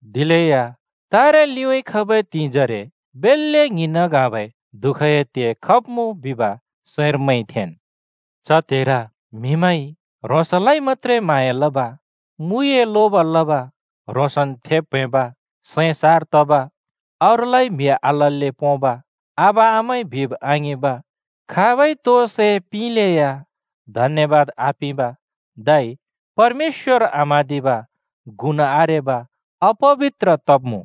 दिलेया तरे लिउँइँ खबै त्हिंइ जरे बेल्‍ले ङ्हिंन् ङ्हाँबै दुःखए त्हे खब्मुँ, बिब सैंर मैंइ थेंन्। च त्हेर म्हिमैंइ ह्रोंसलाइ मत्‍त्रे म्हाँया लब, मुइए लोब लब, ह्रोंसन् थेब् प्‍हैंब, सैं सार तब, अरूलाइ म्हि आलल्‍ले पोंब, आबा-आमाइ बिब आङिंब, खाबइ तो सै पिंलेया धन्यबाद आपिंब धै परमेश्‍वर आम्हाँदिब गुन् आरेब अपबित्र तब्‍मुँ।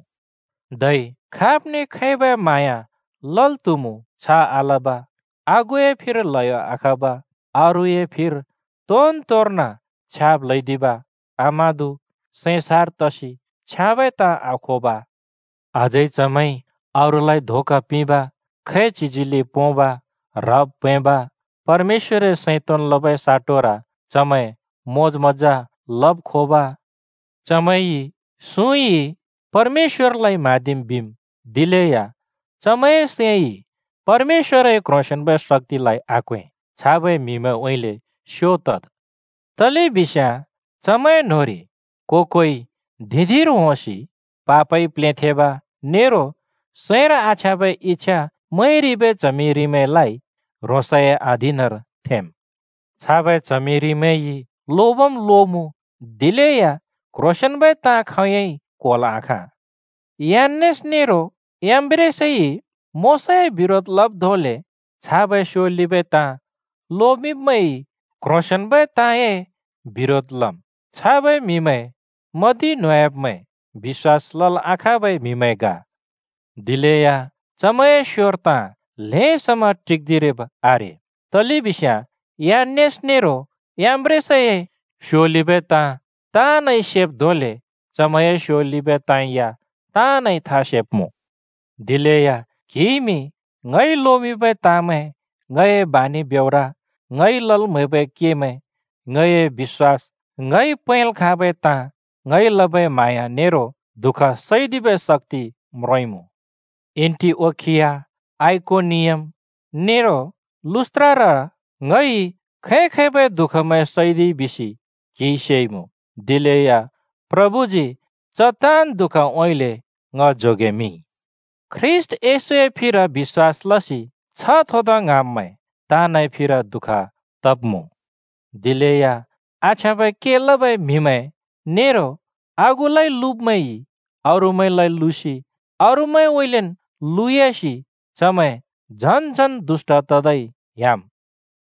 धै खाब्ने खैबै म्हाँया लल् त्हुमु छ आलब, आगुए फिर ल्‍हयो आखब, अरूए फिर तोनतोर्न छ्याब् ल्‍हैदिब, आमादु, सैं सार तसि छ्याँबै ताँ आखोब। अझै चमैंइ अरूलइ धोका पिंब, खैचिज्हिले पोंब, ह्रब् प्‍हैंब, परमेश्‍वरए सैं तोंन् लबै साटोर चमैं मोज-मज्‍जा लब् खोब। चमैंइ सुँइ परमेश्‍वरलाइ म्‍हाँदिम् बिम्, दिलेया चमैंए सैंइ परमेश्‍वरए क्‍ह्रोंसेंन्‍बै शक्‍तिलाइ आक्‍वें। छाबै म्‍हिमैंउँइँले स्‍यो तद्। तलेबिस्याँ चमैं न्होंरि को-कोइ धिं-धिंर होंसि पापइ प्लेंथेंब नेरो सैंर आछ्याँबै इच्छा मैंरिबै च्हमिरिमैंलाइ ह्रोंसए अधीनर थेंम्। छाबै च्हमिरिमैंइ लोबम् लोमुँ, दिलेया क्ह्रोंसेंन्बै ताँ खोंयोंइ क्‍होल् आखाँ। यान्‍नेस नेरो याम्‍ब्रेसइ मोशाए बिरोध लब् धोंले छाबै स्योलिबै ताँ लोमिंब्‍मैंइ क्ह्रोंसेंन्बै ताँए बिरोध लम्। छाबै म्हिमैं मदि न्होंयाब्मैं, बिश्‍वास लल् आखाँबै म्हिमैं ग। दिलेया चमैंए स्‍योर ताँ ल्हें समा टिक्दिरिब् आरे। तलेबिस्याँ यान्‍नेस नेरो याम्‍ब्रेसए स्योलिबै ताँ ताँनइ सेब् धोंले चमैंए स्योलिबै ताँ या ताँनइ था सेब्मुँ। दिलेया क्हिइमि ङइ लोमिंबै ताँमैं, ङए बानि ब्योर, ङइ लल् म्हैबै केमैं, ङए बिश्‍वास, ङइ पैंल् खाँबै ताँ, ङइ लबै म्हाँया नेरो दुःख सैदिबै शक्‍ति म्रोंइमुँ। एन्‍टिओखिया, आइकोनियम नेरो लुस्‍त्रार ङइ खै-खैबै दुःखमैं सैदिइ बिसि क्हिइ सेइमुँ। दिलेया प्रभुजी च ताँन् दुःखउँइँले ङ जोगेमिंइ। ख्रीष्‍ट येशए फिर बिश्‍वास लसि छ्ह थोदा ङ्हाँब्मैं ताँनए फिर दुःख तब्मुँ। दिलेया आछ्याँबै के लबै म्हिमैं नेरो आगुलाइ लुब्मैंइ अरूमैंलाइ लुसि अरूमैंउँइँलेन् लुयासि चमैं झन्-झन् दुष्‍ट त-तै ह्‍याम्।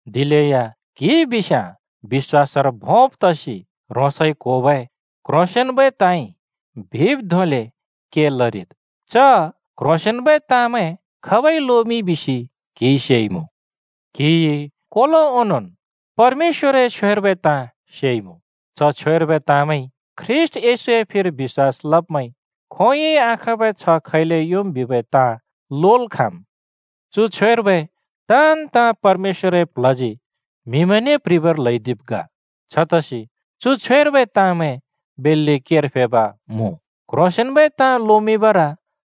दिलेया क्‍हि बिस्याँ बिश्‍वासर भोंब् तसि ह्रोंसइ क्होबै क्ह्रोंसेंन्बै ताँइ बिब् धोंले के लरिद्। च क्ह्रोंसेंन्बै ताँमैं खाबइ लोमिंइ बिसि क्हिइ सेइमुँ। क्‍हिइ कोलो ओनोंन् परमेश्‍वरए छ्वेर्बै ताँ सेइमुँ। च छ्वेर्बै ताँमैंइ ख्रीष्‍ट येशूए फिर बिश्‍वास लब्मैंइ खोंयोंइ आखाँबै छ्ह खैले योंम् बिबै ताँ लोल् खाँम्। चु छ्वेर्बै ताँन् ताँ परमेश्‍वरए प्ल्हजी म्हिमैंने प्ह्रिबर ल्हैदिब् ग। छतसि चु छ्वेर्बै ताँमैं बेल्‍ले केर फेब् मुँ। क्‍ह्रोंसेंन्‍बै ताँ लोमिंबर,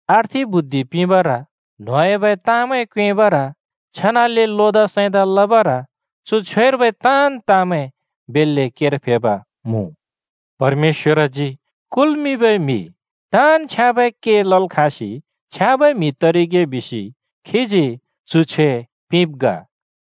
अर्थि बुद्धि पिंबर, न्होंह्‍याबै ताँमैं क्योंएँबर, छेनाले लोदा सैंदा लबर चु छ्वेर्बै ताँन् ताँमैं बेल्‍ले केर फेब् मुँ। परमेश्‍वरजी कुल्मिंबै म्‍हि ताँन् छ्याँबै के लल् खाँसि छ्याँबै म्हि तरिगे बिसि खीजी चु छ्वे पिंब् ग।